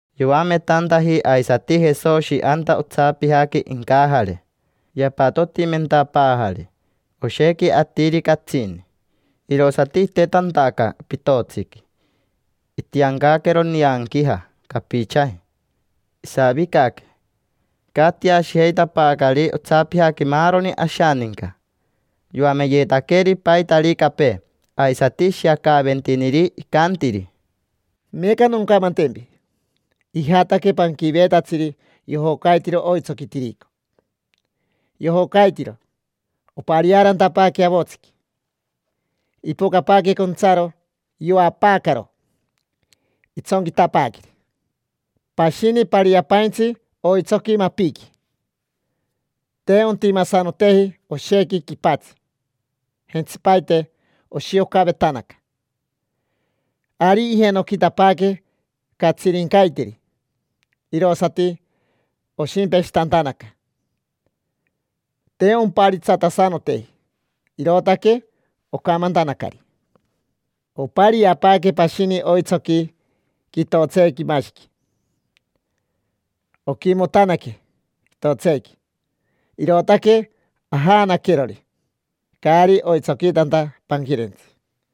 Yoametantaji aisati Jesoshi anta otsapijaqui incajare. Yapatotimentapaajari oshequi atiri catsini. Irosati itetantaca pitotsiqui, itiancaquero nianquija capichaji, isavicaque. Icatiashijeitapaacari otsapijaqui maaroni ashaninca. Yoameyetaqueri paitaricapee, aisati ishiacaaventiniri, icantiri: —Meeca noncamantempi. Ijataque panquiveetatsiri yojocaitiro oitsoqui tirico. Yojocaitiro, opariaarantapaaque avotsiqui. Ipocapaaque contsaro, yoapaacaro, itsonquitapaaqueri. Pashini pariapaintsi oitsoqui mapiqui. Te ontimasanoteji oshequi quipatsi, jentsipaite oshiocavetanaca. Ari ijenoquitapaaque catsirincaiteri, irosati oshimpeshitantanaca. Te omparitsatasanoteji, irootaque ocamantanacari. Opariapaaque pashini oitsoqui quitotseequimashiqui, oquimotanaque quitotseequi. Irootaque ajaanaquerori, caari oitsoquitanta panquirentsi.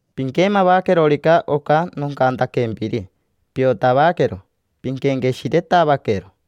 Piquemavaquerorica oca nocantaquempiri, piotavaquero, pinquenqueshiretavaquero.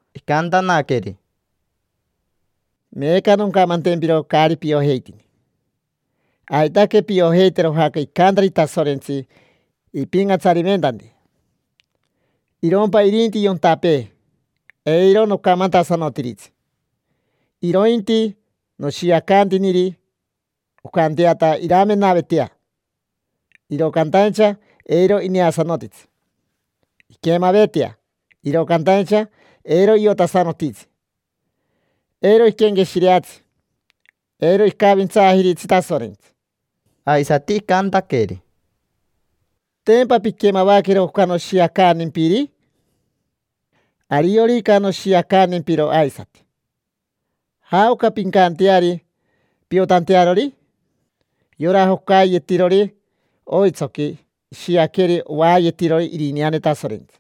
Icantanaqueri: —Meeca noncamantempiro caari piojeitini: aitaque piojeitero jaoca icantari Tasorentsi ipincatsariventanti. Irompa irinti yontapee, eiro nocamantasanotiritsi, irointi noshiacantiniri oncanteata iramenavetea, iro cantaincha eiro ineasanotitsi, inquemavetea, iro cantaincha eiro iotasanotitsi. Eiro iquenqueshireatsi, eiro icavintsaajiritsi Tasorentsi. Aisati icantaqueri: —¿Tempa pinquemavaquero oca noshiacantimpiri? Ariorica noshiacantempiro aisati, ¿jaoca pincanteari piotantearori? Yora jocaiyetirori oitsoqui ishiaqueri ovaayetirori irineane Tasorentsi.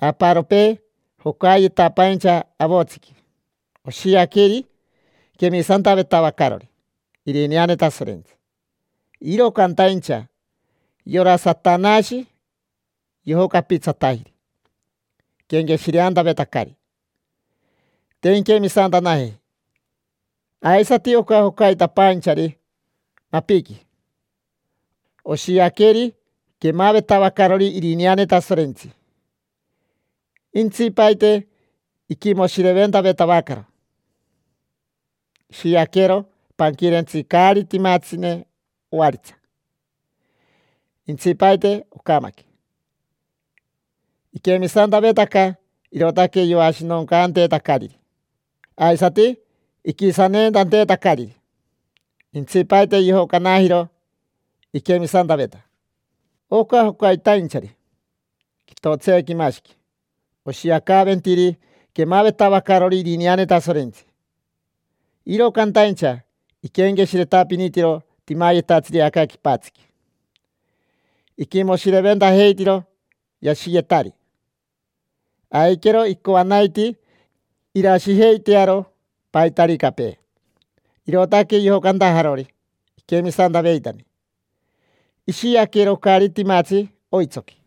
Aparopee jocaiyetapaincha avotsiqui oshiaqueri quemisantavetavacarori irineane Tasorentsi, iro cantaincha yora Satanashi yojocapitsatajiri iquenqueshireantavetacari: te inquemisantanajeji. Aisati oca jocaitapainchari mapiqui, oshiaqueri quemavetavacarori irineane Tasorentsi. Intsipaite iquimoshireventavetavacaro. Ishiaquero panquirentsi caari timatsine ovaritsa. Intsipaite ocamaque. Iquemisantavetaca, irootaque yoashinoncanteetacariri, aisati iquisanentanteetacariri. Intsipaite yojocanajiro iquemisantaveta. Oca jocaitainchari quitotseequimashiqui oshiacaaventiri quemavetavacarori irineane Tasorentsi. Iro cantaincha iquenqueshiretapinitiro timayetatsiri aca quipatsiqui, iquimoshireventajeitiro yashiyetari. Aiquero icoanaitii irashijeitearo paitaricapee, irootaque yojocantajarori iquemisantavetari. Ishiaquero caari timatsi oitsoqui.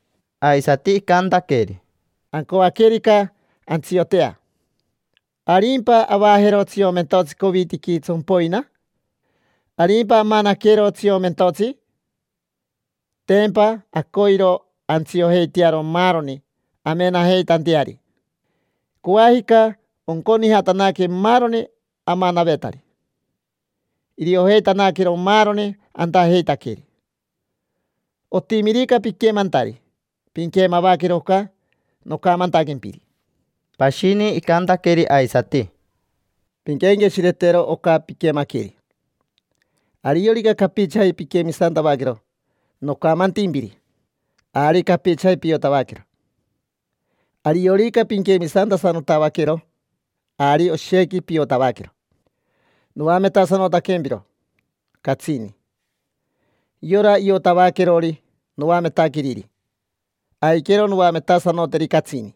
Aisati icantaqueri: —Ancoaquerica antsiotea, ¿arimpa avajero tsiomentotsi covitiqui tsompoina? ¿Arimpa amanaquero tsiomentotsi? Tempa acoiro antsiojeitearo maaroni amenajeitanteari. Coajica onconijatanaque maaroni amanavetari, iriojeitanaquero maaroni antajeitaqueri. Otimirica piquemantari, pinquemavaquero oca nocamantaquempiri. Pashini icantaqueri aisati: —Pinquenqueshiretero oca piquemaqueri. Ariorica capichaji pinquemisantavaquero nocamantimpiri, ari capichaji piotavaquero. Ariorica pinquemisantasanotavaquero, ari oshequi piotavaquero, noametasanotaquempiro catsini. Yora iotavaquerori noametaqueriri, aiquero noametasanoteri catsini.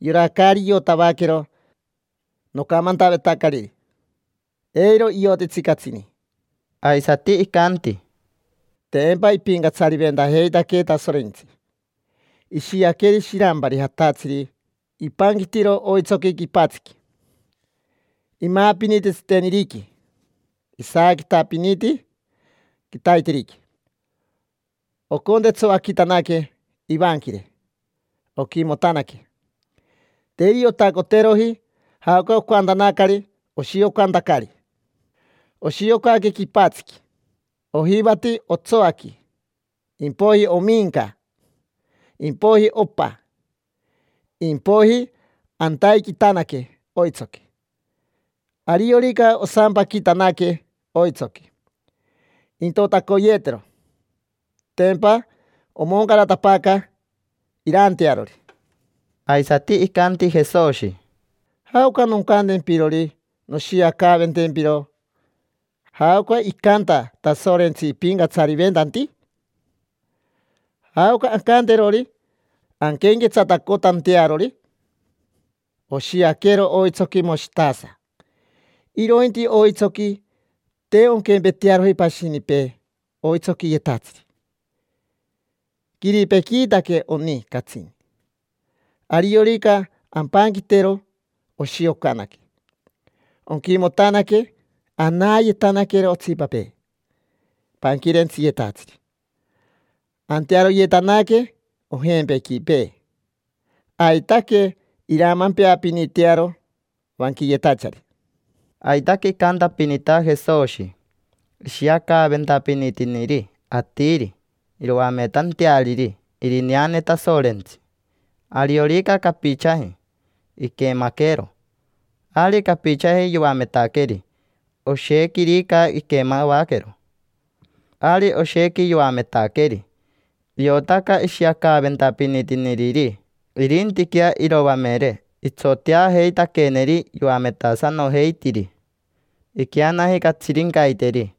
Yora caari iotavaquero nocamantavetacariri, eiro iotitsi catsini. Aisati icanti: —Tempa ipincatsariventajeitaquee Tasorentsi. Ishiaqueri shirampari jatatsiri ipanquitiro oitsoqui quipatsiqui. Imaapiniti tsiteniriqui, isaaquitapiniti quitaiteriqui. Ocontetsoaquitanaque ivanquire, oquimotanaque. Te iriotacoteroji jaoca ocantanacari oshiocantacari. Oshiocaque quipatsiqui: ojivati otsoaqui, impoiji ominca, impoiji opa, impoiji antaiquitanaque oitsoqui. Ariorica osampaquitanaque oitsoqui, intotacoyeetero, tempa omoncaratapaaca iraantearori. Aisati icanti Jesoshi: —¿Jaoca noncantempirori noshiacaaventempiro jaoca icanta Tasorentsi ipincatsariventanti? ¿Jaoca ancanterori anquenquetsatacotantearori? Oshiaquero oitsoqui moshitasa. Irointi oitsoqui, te onquempetearoji pashinipee oitsoquiyetatsiri: quiripequiitaque oni catsini. Ariorica ampanquitero, oshiocanaque. Onquimotanaque, anayetanaquero otsipapee panquirentsiyetatsiri. Antearoyetanaque ojempequipee, aitaque iramampeapinitearo vanquiyetachari. Aitaque icantapinita Jesoshi, ishiacaaventapinitiniri atiri iroametanteariri irineane Tasorentsi. Ariorica capichaji iquemaquero, ari capichaji yoametaqueri: oshequirica iquemavaquero, ari oshequi yoametaqueri. Iotaca ishiacaaventapinitiniriri. Irintiquea iroamere, itsoteajeitaqueneri yoametasanojeitiri. Iqueanaji catsirincaiteri.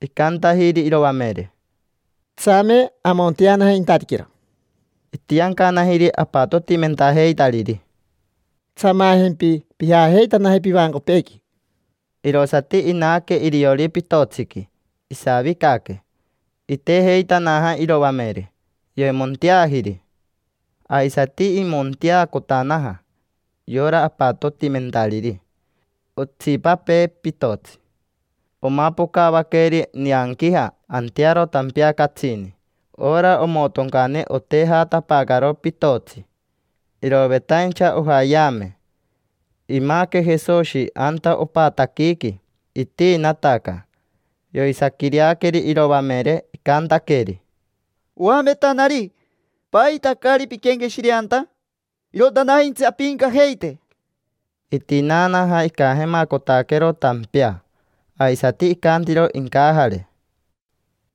Icantajiri iroamere: —Tsame amonteanaje intatiquero. Itiancanajiri apatotimentajeitariri: —Tsamajempi pijajeitanaje pivancopeequi. Irosati inaque iriori pitotsiqui, isavicaque. Itejeitanaja iroamere, yoimonteajiri. Aisati imonteacotanaja yora apatotimentariri otsipapee pitotsi. Omapocavaqueri nianquija antearo tampea catsini. Ora omotoncane otejatapaacaro pitotsi, irovetaincha ojaayeame. Imaaque Jesoshi anta opataquiqui, itiinataca. Yoisaaquireaqueri iroamere, icantaqueri: —Oametanari, ¿paita caari pinquenqueshireanta? Irotanaintsi ampiincajeite. Itinaanaja, icajemacotaquero tampea, aisati icantiro incajare: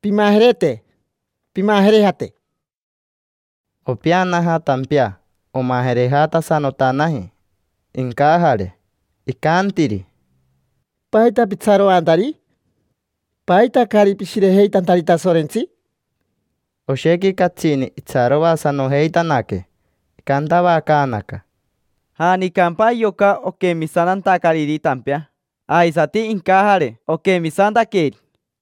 —Pimajerete, pimajerejate. Opeanaja tampea. Omajerejatasanotanaji incajare. Icantiri: —¿Paita pitsaroantari? ¿Paita caari pishirejeitantari Tasorentsi? Oshequi catsini itsaroasanojeitanaque. Icantavacaanaca: —¿Janicampa yoca, oquemisantantacariri tampea? Aisati incajare, oquemisantaqueri.